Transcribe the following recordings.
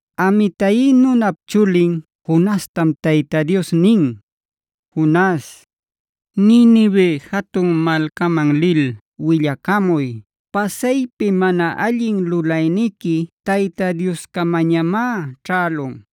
Amitai nunap chulin Jonastama Tayta Dios nin: “Jonas, Ninive jatun malcaman lil willacamuy ‘Pasaypi mana allin lulayniqui Tayta Dioscamañamá ćhälun.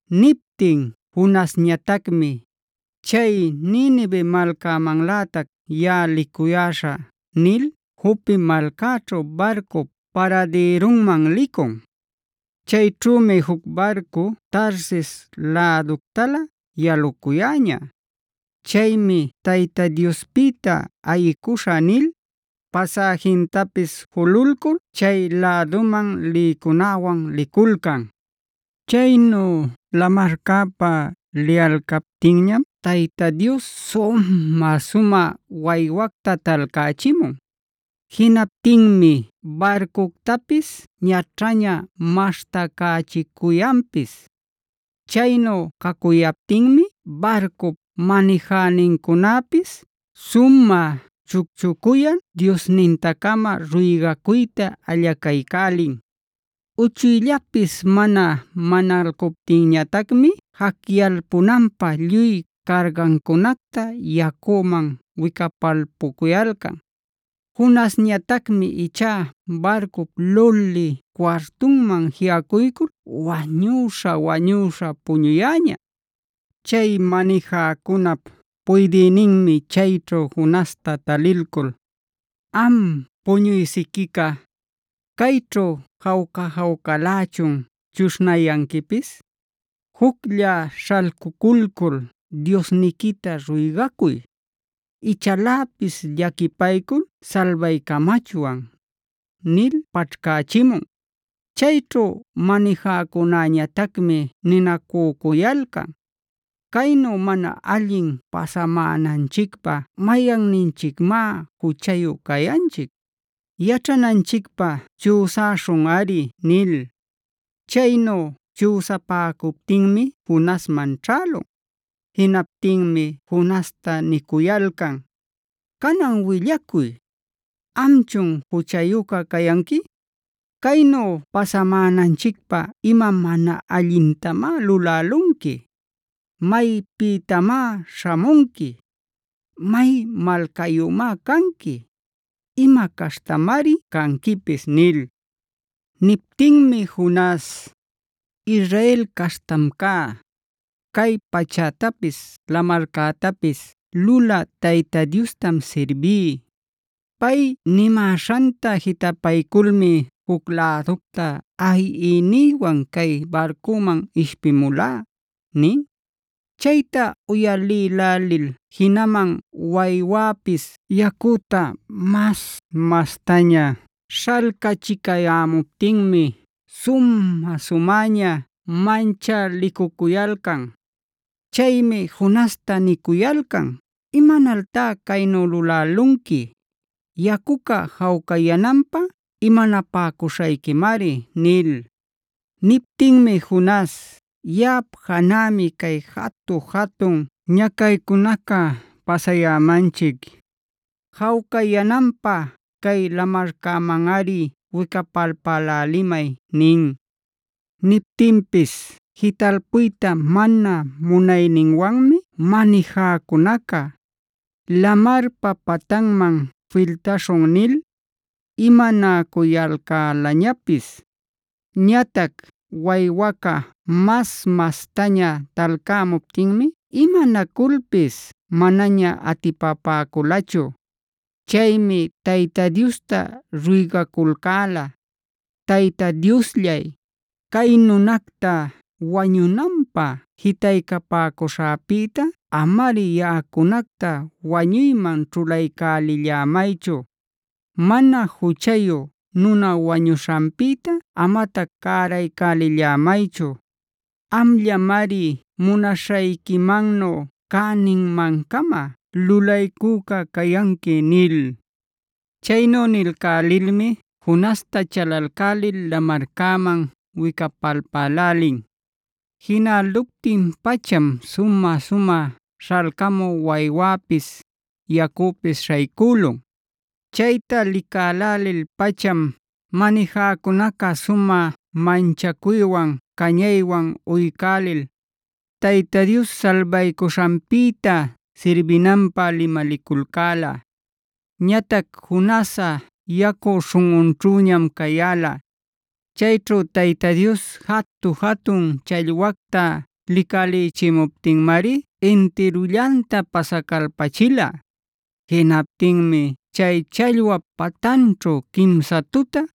Niptin Jonasñatacmi “Chay Ninive malcämanlätac yaꞌa licuyäśhä” nil Jope malcaćhu barcup paradïrunman licun. Chayćhümi juc barcu Tarsis läductalä yalucuyäña. Chaymi “Tayta Diospïta ayicuśhä” nil, pasäjintapis jululcul chay läduman lïcunäwan liculcan. Chaynu lamarcäpa liyalcaptinñam Tayta Dios sumä-sumä waywacta talcächimun. Jinaptinmi barcuctapis ñaćhaña maśhtacächicuyanpis. Chaynu cacuyaptinmi barcup manijänincunapis sumä chucchucuyal diosninta-cama ruygacuyta allacaycälin. Uchuyllapis mana manalcuptinñatacmi jacyalpunanpä lluy cargancunacta yacüman wicapalpucuyalcan. Jonasñatacmi ichá barcup lulï cuartunman jiꞌacuycul wañuśha-wañuśha puñuyäña. Chay manijäcunap puydïninmi chayćhu Jonasta talilcul: “¿Am puñuy-siquicá, cayćhu jawca-jawcalächun chuśhnayanquipis? ¡Juclla śhalcuculcul diosniquita ruygacuy! Ichaläpis llaquipaycul salbaycamachwan” nil paćhcächimun. Chayćhu manijäcunäñatacmi ninacücuyalcan: “¿Caynu mana allin pasamänanchicpä mayanninchicmá juchayu cayanchic? Yaćhananchicpä chüsaśhunꞌari” nil. Chaynu chüsapäcuptinmi Jonasman ćhälun. Jinaptinmi Jonasta nicuyalcan: “Canan willacuy. ¿Amchun juchayüca cayanqui? ¿Caynu pasamänanchicpä ima mana allintamá lulälanqui? ¿Maypïtamá śhamunqui? ¿May malcayümá canqui? ¿Ima caśhtamari canquipis?” nil. Niptinmi Jonas: “Israel caśhtam cá. Cay pachätapis, lamarcätapis lulä Tayta Diostam sirbí. Pay nimäśhanta jitapayculmi juc läducta ayiynïwan cay barcüman ishpimulá” nin. Chayta uyalïlälil jinaman waywäpis yacüta mas-mastaña śhalcachicayämuptinmi sumä-sumäña manchalicucuyalcan. Chaymi Jonasta nicuyalcan: “¡Imanaltá caynu lulalanqui! ¡Yacuca jawcayänanpä imanapäcuśhayquimari!” nil. Niptinmi Jonas: “Yaꞌap janämi cay jatu-jatun ñacaycunaca pasayämanchic. Jawcayänanpä cay lamarcämanꞌari wicapalpälälimay” nin. Niptinpis jitalpuyta mana munayninwanmi manijäcunaca “lamarpa patanman filtaśhun” nil imanacuyalcälañapis. Ñatac waywaca mas-mastaña talcämuptinmi imanaculpis manaña atipapäculachu. Chaymi Tayta Diosta ruygaculcäla: “Tayta Diosllay, cay nunacta wañunanpä jitaycapäcuśhäpïta amari yaꞌacunacta wañuyman ćhulaycälillämaychu. Mana juchayu nuna wañuśhanpïta amatac cäraycälillämaychu. Amllamari munaśhayquimannu cäninmancama lulaycüca cayanqui” nil. Chaynu nilcälilmi Jonasta chalalcälil lamarcäman wicapalpälälin. Jinäluptin-pacham sumä-sumä śhalcamü waywäpis, yacüpis śhaycülun. Chayta licälälil-pacham manijäcunaca sumä manchacuywan cañaywan uycälil, Tayta Dios salbaycuśhanpïta sirbinanpä limaliculcäla. Ñatac Jonasꞌa yacu śhunꞌunćhüñam cayäla. Chayćhu Tayta Dios jatu-jatun challwacta licalïchimuptinmari intirullanta pasacalpachila. Jinaptinmi chay challwap patanćhu quimsa tuta,